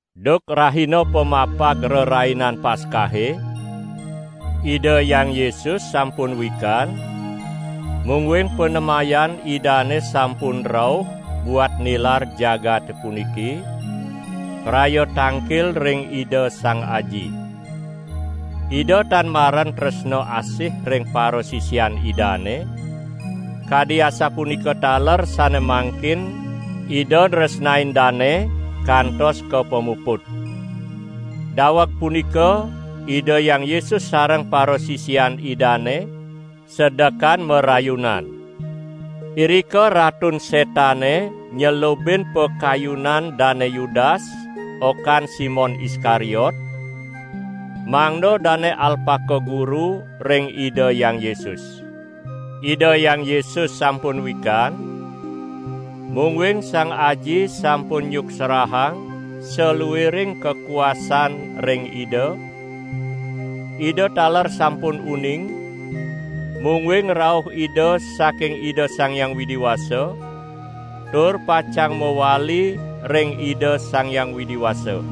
Duk rahina pamapag Rerainan Paskahe, Ida Hyang Yesus sampun wikan mungguing panemayan Idane sampun rauh buat nilar jagate puniki praya tangkil ring Ida Sang Aji. Ida tan maren tresna asih ring parasisian Idane, kadi asapunika taler sane mangkin Ida nresnain dane kantos ka pamuput. Daweg punika Ida Hyang Yesus sareng parasisian Idane sedekan marayunan. Irika Ratun Setane nyelubin pakayunan Dane Yudas okan Simon Iskariot, mangda dane alpaka guru ring Ida Hyang Yesus. Ida Hyang Yesus sampun wikan, mungguing Sang Aji sampun nyuksrahang saluiring kakuasan ring Ida; Ida taler sampun uning, mungguing rauh Ida saking Ida Sang Hyang Widi Wasa, tur pacang mawali ring Ida Sang Hyang Widi Wasa.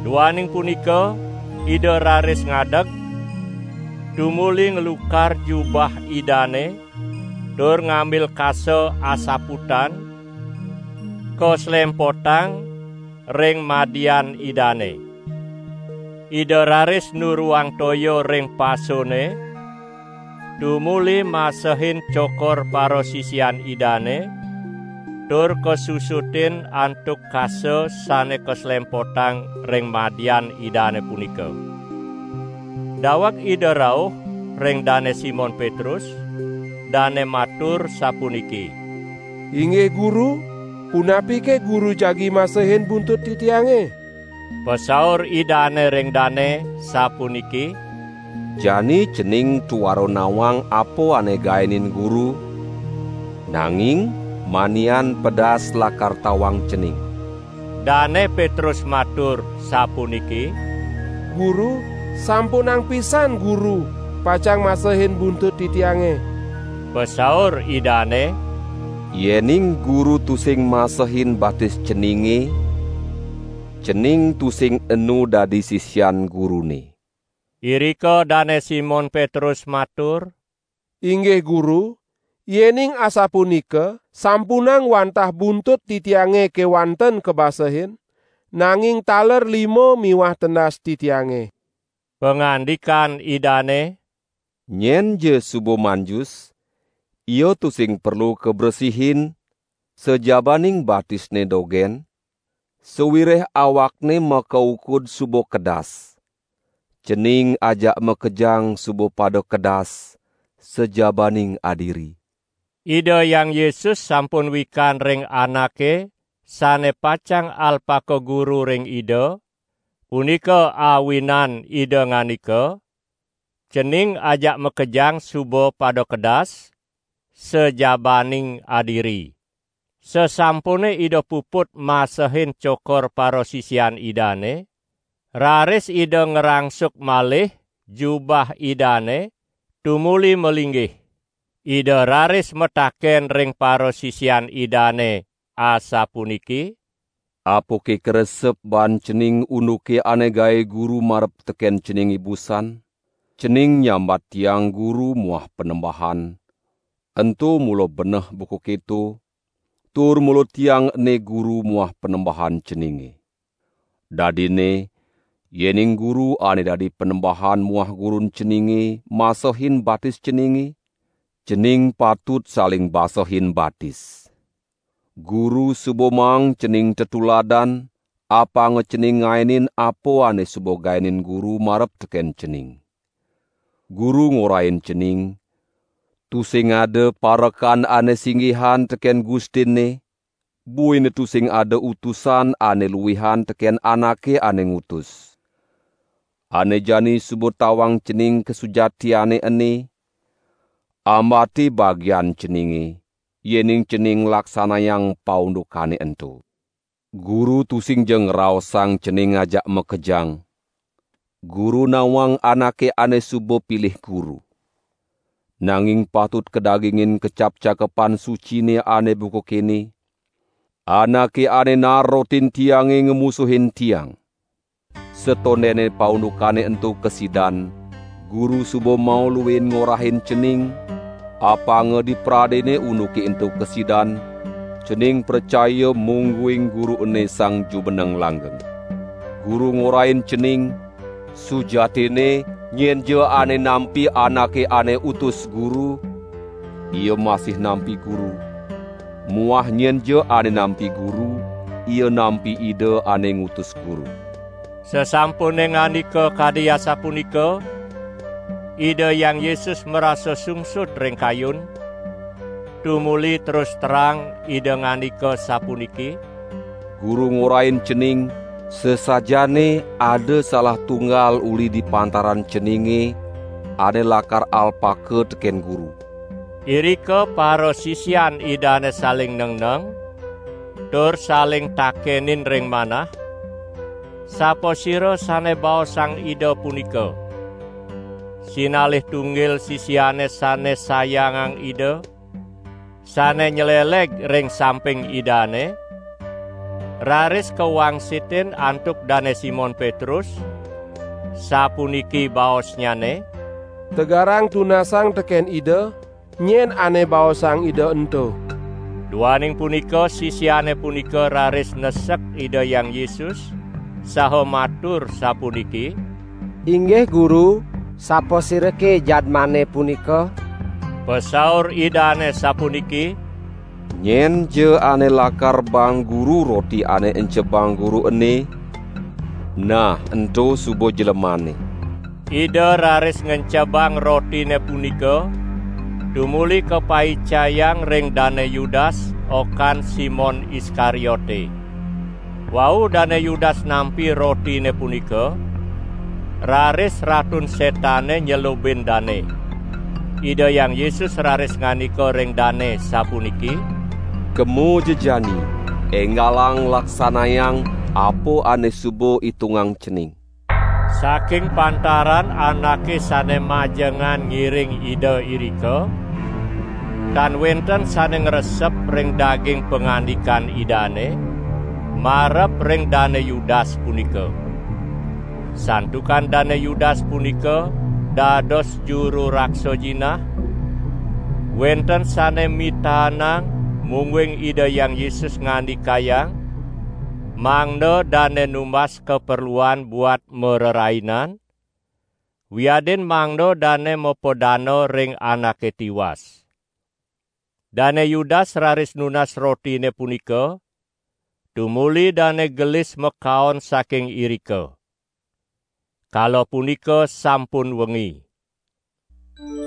Duaning punika Ida raris ngadeg, tumuli nglukar jubah Idane tur ngambil kasa asaputan kaslempotang ring madian Idane. Ida raris nuruang toya ring pasone tumuli masehin cokor parasisian Idane tur kasusutin antuk kasa sane kaslempotang ring madian Idane punika. Daweg Ida rauh ring Dane Simon Petrus, dane matur sapuniki: "Inggih Guru, punapike Guru jagi masehin buntut titiange?" Pasaur Idane ring dane sapuniki: "Jani cening tuara nawang apa ane gaenin Guru, nanging manian pedas lakar tawang cening!" Dane Petrus matur sapuniki: "Guru, sampunang pisan Guru pacang masehin buntut titiange!" Pasaur Idane: "Yening Guru tusing masehin batis ceninge, cening tusing enu dadi sisian Gurune!" Irika Dane Simon Petrus matur: "Inggih Guru, yening asapunika sampunang wantah buntut titiange kewanten kabasehin; nanging taler lima miwah tendas titiange!" Pangandikan Idane: "Nyenja suba manjus, ia tusing perlu kabresihin sajabaning batisne dogen, sawireh awakne makaukud suba kedas. Cening ajak makejang suba pada kedas, sajabaning adiri!" ( Ida Hyang Yesus sampun wikan ring anake sane pacang alpaka guru ring Ida; punika awinan Ida ngandika: "Cening ajak makejang suba pada kedas, sajabaning adiri!") Sasampune Ida puput masehin cokor parasisian Idane, raris Ida ngrangsuk malih jubah Idane, tumuli malinggih. Ida raris mataken ring parasisian Idane asapuniki: "Apake karesep baan cening unduke ane gae Guru marep teken cening ibusan? Cening nyambat Tiang Guru muah Panembahan, ento mula beneh buka keto, tur mula Tiang ene Guru muah Panembahan ceninge! Dadinne yening Guru ane dadi Panembahan muah Gurun ceninge masehin batis ceninge, cening patut saling basehin batis. Guru suba maang cening tetuladan, apanga cening ngaenin apa ane suba gaenin Guru marep teken cening. Guru ngorahin cening: Tusing ada parekan ane singgihin teken gustinne buina tusing ada utusan ane luihan teken anake ane ngutus. Ane jani suba tawang cening kasujatiane ene: ambate bagian ceninge, yening cening nglaksanayang paundukane ento! Guru tusingja ngraosang cening ajak makejang; Guru nawang anake ane suba pilih Guru. Nanging patut kadagingin kecap Cakepan Sucine ane buka kene: 'Anake ane naar rotin tiange ngamusuhin tiang!' Satondene paundukane ento kasidan, Guru suba mauluin ngorahin cening, apanga dipradene unduke ento kasidan, cening pracaya mungguing Guru ene Sang Jumeneng Langgeng. Guru ngorahin cening: sujatinne nyenja ane nampi anake ane utus Guru, ia masih nampi Guru; muah nyenja ane nampi Guru, ia nampi Ida ane ngutus Guru." Sasampune ngandika kadi asapunika, Ida Hyang Yesus marasa sungsut ring kayun, tumuli terus terang Ida ngandika sapuniki: "Guru ngorahin cening, sasajaane ada salah tunggal uli di pantaran ceninge ane lakar alpaka teken Guru." Irika parasisian Idane saling nengneng, tur saling takenin ring manah, sapasira sane baosang Ida punika. Sinalih tunggil sisiane sane sayangang Ida sane nyleleg ring samping Idane, raris kawangsitin antuk Dane Simon Petrus, sapuniki baosnyane: "Tegarang tunasang teken Ida, nyen ane baosang Ida ento!" Duaning punika sisiane punika raris nesek Ida Hyang Yesus saha matur sapuniki: "Inggih Guru, sapasirake jadmane punika?" Pasaur Idane sapuniki: "Nyenja ane lakar baang Guru roti ane encebang Guru ene, nah ento suba jlemanne." Ida raris ngencebang rotine punika tumuli kapaicayang ring Dane Yudas, okan Simon Iskariote. Wau Dane Yudas nampi rotine punika, raris Ratun Setane nyelubin dane. Ida Hyang Yesus raris ngandika ring dane sapuniki: "Kemaja jani enggalang laksanayang apa ane suba itungang cening!" Saking pantaran anake sane majengan ngiring Ida irika, tan wenten sane ngresep ring daging pangandikan Idane, marep ring Dane Yudas punika. Santukan Dane Yudas punika dados juru raksa jinah, wenten sane mitaenang mungguing Ida Hyang Yesus ngandikayang mangda dane numbas kaperluan buat marerainan, wiadin mangda dane mapadana ring anake tiwas. Dane Yudas raris nunas rotine punika, tumuli dane gelis makaon saking irika. Kala punika sampun wengi.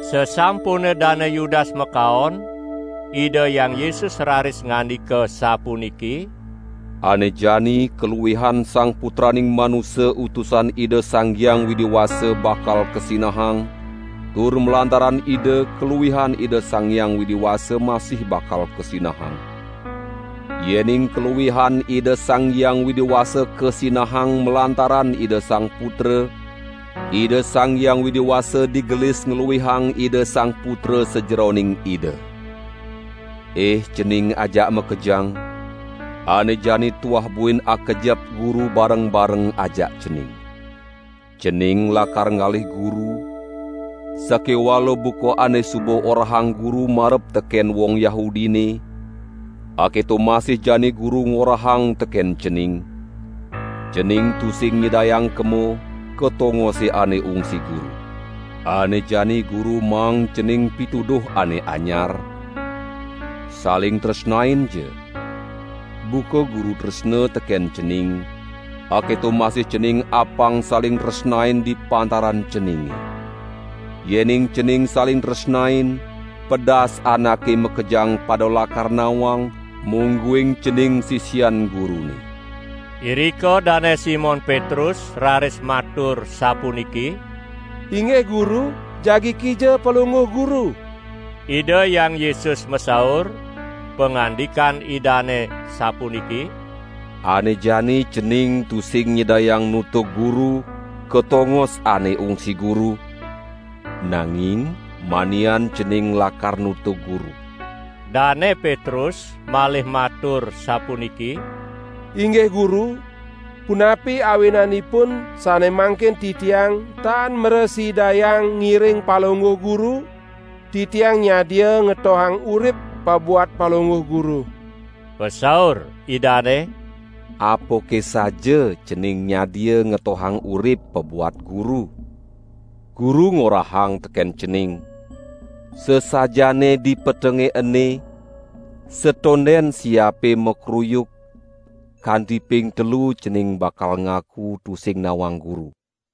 Sasampune Dane Yudas makaon, Ida Hyang Yesus raris ngandika sapuniki: "Ane jani kaluihan Sang Putraning Manusa Utusan Ida Sang Hyang Widi Wasa bakal kasinahang tur malantaran Ida kaluihan Ida Sang Hyang Widi Wasa masih bakal kasinahang. Yening kaluihan Ida Sang Hyang Widi Wasa kasinahang malantaran Ida Sang Putra, Ida Sang Hyang Widi Wasa digelis ngluihang Ida Sang Putra sajeroning Ida. Ih cening ajak makejang, ane jani tuah buin akejep Guru bareng-bareng ajak cening. Cening lakar ngalih Guru, sakewala buka ane suba orahang Guru marep teken wong Yahudine, aketo masih jani Guru ngorahang teken cening: 'Cening tusing nyidayang kema ka tongose ane ungsi Guru.' Ane jani Guru maang cening pituduh ane anyar: saling tresnainja! Buka Guru tresna teken cening, aketo masih cening apang saling tresnain di pantaran ceninge. Yening cening saling tresnain, pedas anake makejang pada lakar nawang, mungguing cening sisian Gurune!" Irika Dane Simon Petrus raris matur sapuniki: "Inggih Guru, jagi kija Palungguh Guru?" Ida Hyang Yesus masaur, pangandikan Idane sapuniki: "Ane jani cening tusing nyidayang nutug Guru ka tongos ane ungsi Guru, nanging manian cening lakar nutug Guru." Dane Petrus malih matur sapuniki: "Inggih Guru, punapi awinanipun sane mangkin titiang tan mrasidayang ngiring Palungguh Guru? Titiang nyadia ngetohang urip pabuat Palungguh Guru." Pasaur Idane: "Apake saja cening nyadia ngetohang urip pabuat Guru? Guru ngorahang teken cening: sasajaane dipetenge ene, satonden siape makruyuk, kanti ping telu cening bakal ngaku tusing nawang Guru."